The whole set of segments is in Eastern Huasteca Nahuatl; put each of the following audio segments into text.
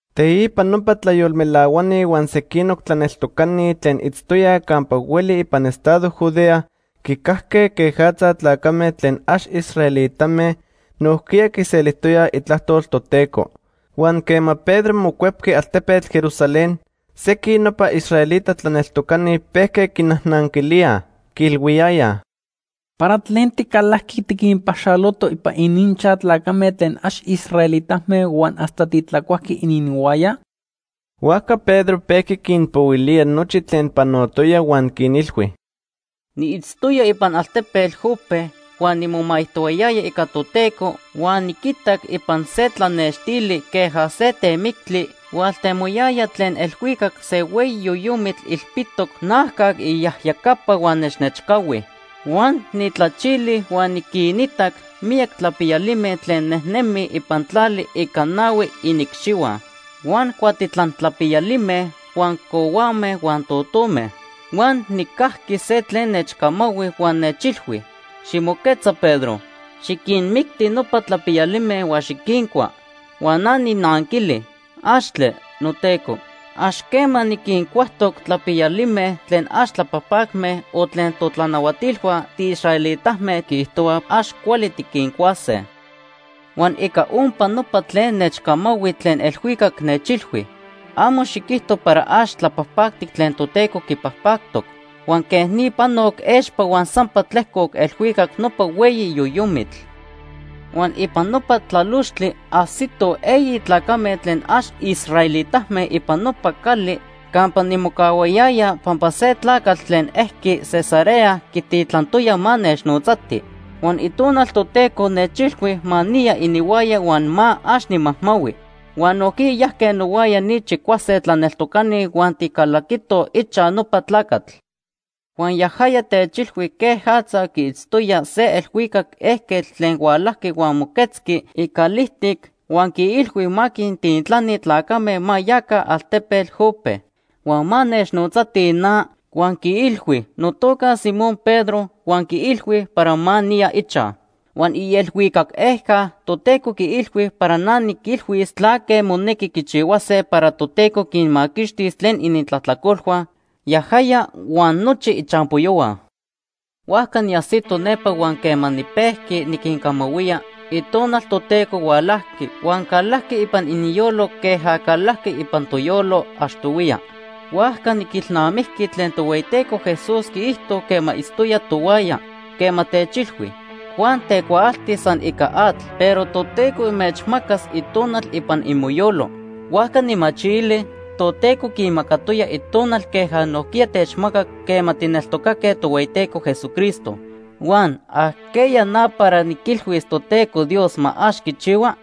Teipa nopa tlayolmelahuani huan sequinoc tlaneltocani tlen itztoyaj campa hueli ipan estado Judea quicajque quejatza tlacame tlen ax israelitame nojquiya quiselijtoyaj itlajtol Toteco. Huan quema Pedro mocuepqui altepetl Jerusalén, sequin nopa israelita tlaneltocani pejque quinajnanquilíaj. Quiilhuiyayaj: ―¿Para tlen ticalajqui tiquinpaxaloto ipan ininchaj tlacame tlen ax israelitame huan hasta titlacuajqui ininhuaya? Huajca Pedro pejqui quinpohuilía nochi tlen panotoya huan quinilhui: ―Niitztoya ipan altepetl Jope huan nimomaijtohuayaya ica Toteco huan niquitac ipan se tlanextili queja se temictli, hualtemoyaya tlen elhuicac se hueyi yoyomitl ilpitoc najcac iyajyacapa huan nechnechcahui. Huan nijtlachili huan niquinitac miyac tlapiyalime tlen nejnemij ipan tlali ica nahui iniicxihua, huan cuatitlan tlapiyalime, huan cohuame huan totome. Huan nijcajqui se tlen nechcamahui huan nechilhui: ‘Ximoquetza Pedro, xiquinmicti nopa tlapiyalime huan xiquincua.’ “Huan na nijnanquili: ‘¡Axtle, noTeco! Ax quema niquincuajtoc tlapiyalime tlen ax tlapajpacme o tlen totlanahuatilhua tiisraelitame quiijtohuaj ax cuali tiquincuase.’ “Huan ica ompa nopa tlen nechcamahui tlen elhuicac nechilhui: ‘Amo xiquijto para ax tlapajpactic tlen Toteco quipajpactoc.’ Huan quej ni panoc expa huan sampa tlejcoc elhuicac nopa hueyi yoyomitl. “Huan ipan nopa tlalochtli ajsitoj eyi tlacame tlen ax israelitame ipan nopa cali campa nimocahuayaya pampa se tlacatl tlen ejqui Cesarea quintitlantoya ma nechnotzatij. Huan Itonal Toteco nechilhui ma niya ininhuaya huan ma ax nimajmahui. Huan nojquiya yajque nohuaya ni chicuase tlaneltocani huan ticalaquitoj ichaj nopa tlacatl. Huan yajaya techilhui quejatza quiitztoya se elhuicac ejquetl tlen hualajqui huan moquetzqui icalijtic huan quiilhui ma quintitlani tlacame ma yaca altepetl Jope, huan ma nechnotzatij na huan quiilhui notoca Simón Pedro huan quiilhui para ma niya ichaj. Huan ielhuicac ejca Toteco quiilhui para na niquilhuis tlaque monequi quichihuase para Toteco quinmaquixtis tlen inintlajtlacolhua, yajaya huan nochi ichampoyohua. “Huajca niajsito nepa huan quema nipejqui niquincamahuía, Itonal Toteco hualajqui, huan calajqui ipan ininyolo queja calajqui ipan toyolo achtohuiya. Huajca niquilnamijqui tlen Tohueyiteco Jesús quiijto quema itztoya tohuaya, quema techilhui: ‘Juan tecuaalti san ica atl, pero Toteco inmechmacas Itonal ipan imoyolo.’ Huajca nijmachili, Toteco quinmacatoya Itonal queja nojquiya techmacac quema tijneltocaque Tohueyiteco Jesucristo. Huan ¿ajqueya na para niquilhuis Toteco Dios ma ax quichihua?”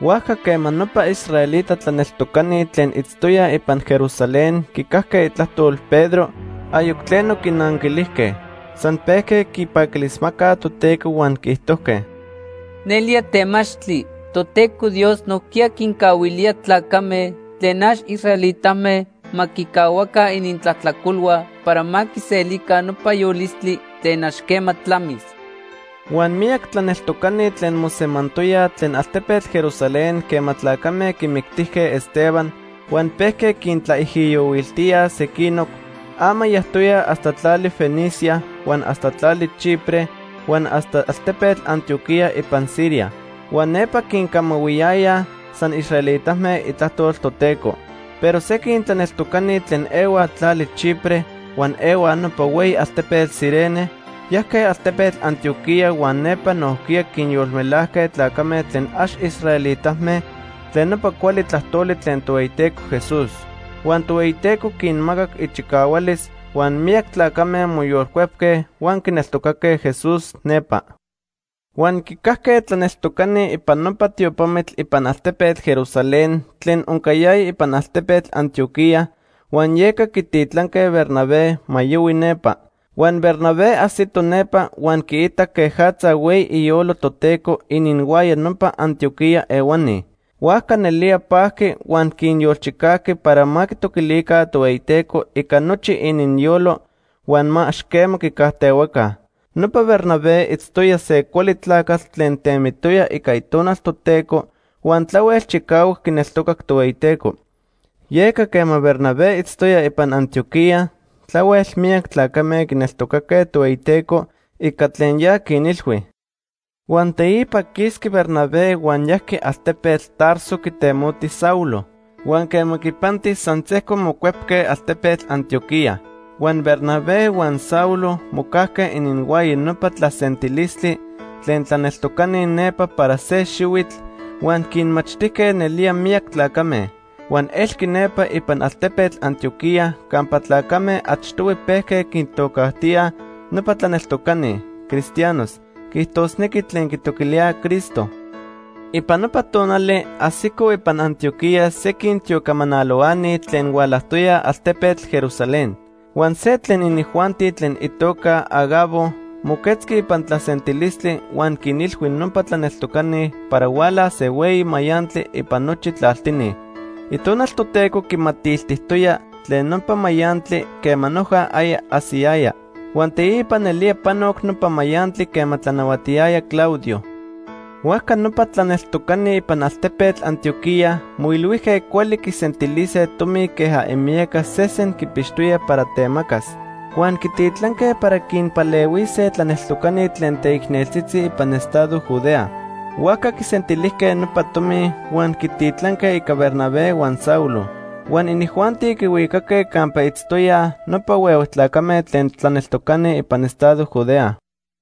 Huajca quema nopa israelita tlaneltocani tlen itztoyaj ipan Jerusalén quicajque itlajtol Pedro, ayoc tleno quinanquilijque. San pejque quipaquilismacaj Toteco huan quiijtojque: ―Nelía temachtli Toteco Dios nojquiya quincahuilía tlacame tlen ax israelitame ma quicahuaca inintlajtlacolhua para ma quiselica nopa yolistli tlen ax quema tlamis. Huan miyac tlaneltocani tlen mosemantoyaj tlen altepetl Jerusalén quema tlacame quimictijque Esteban huan pejque quintlaijiyohuiltíaj sequinoc, ama yajtoyaj hasta tlali Fenicia, huan hasta tlali Chipre huan hasta altepetl Antioquía ipan Siria. Huan nepa quincamahuiyayaj san israelitame itlajtol Toteco. Pero sequin tlaneltocani tlen ehuaj tlali Chipre huan ehuaj nopa hueyi altepetl Cirene, yajque altepetl Antioquía huan nepa nojquiya quinyolmelajque tlacame tlen ax israelitame tlen nopa cuali tlajtoli tlen Tohueyiteco Jesús. Huan Tohueyiteco quinmacac ichicahualis, huan miyac tlacame moyolcuepque huan quineltocaque Jesús nepa. Huan quicajque tlaneltocani ipan nopa tiopamitl ipan altepetl Jerusalén tlen oncayaya ipan altepetl Antioquía, huan yeca quititlanque Bernabé ma yohui nepa. Huan Bernabé ajsito nepa huan quiitac quejatza hueyi iyolo Toteco ininhuaya nopa Antioquía ehuani. Huajca nelía pajqui huan quinyolchicajqui para ma quitoquilica Tohueyiteco ica nochi ininyolo huan ma ax quema quicajtehuaca. Nopa Bernabé itztoya se cuali tlacatl tlen temitoya ica Itonal Toteco huan tlahuel chicahuac quineltocac Tohueyiteco. Yeca quema Bernabé itztoya ipan Antioquía tlahuel miyac tlacame quineltocaque Tohueyiteco ica tlen ya quinilhui. Huan teipa quisqui Bernabé huan yajqui altepetl Tarso quitemoti Saulo. Huan quema quipanti, san sejco mocuepque altepetl Antioquía. Huan Bernabé huan Saulo mocajque ininhuaya nopa tlasentilistli tlen tlaneltocani nepa para se xihuitl huan quinmachtijque nelía miyac tlacame. Huan elqui nepa ipan altepetl Antioquía campa tlacame achtohui pejque quintocajtíaj nopa tlaneltocani “cristianos”, quiijtosnequi, tlen quitoquilíaj Cristo. Ipan nopa tonali, ajsicoj ipan Antioquía sequin tiocamanalohuani tlen hualajtoyaj altepetl Jerusalén. Huan se tlen inijuanti tlen itoca Agabo moquetzqui ipan tlasentilistli huan quinilhui nopa tlaneltocani para hualas se hueyi mayantli ipan nochi tlaltini. Itonal Toteco quimatiltijtoya tlen nopa mayantli quema noja aya ajsiyaya. Huan teipa nelía panoc nopa mayantli quema tlanahuatiyaya Claudio. Huajca nopa tlaneltocani ipan altepetl Antioquía moilhuijque cuali quisentilise tomi queja imiyaca sesen quipixtoyaj para temacas. Huan quititlanque para quinpalehuise tlaneltocani tlen teicneltzitzi ipan estado Judea. Huajca quisentilijque nopa tomi huan quititlanque ica Bernabé huan Saulo. Huan inijuanti quihuicaque campa itztoyaj nopa huehue tlacame tlen tlaneltocani ipan estado Judea.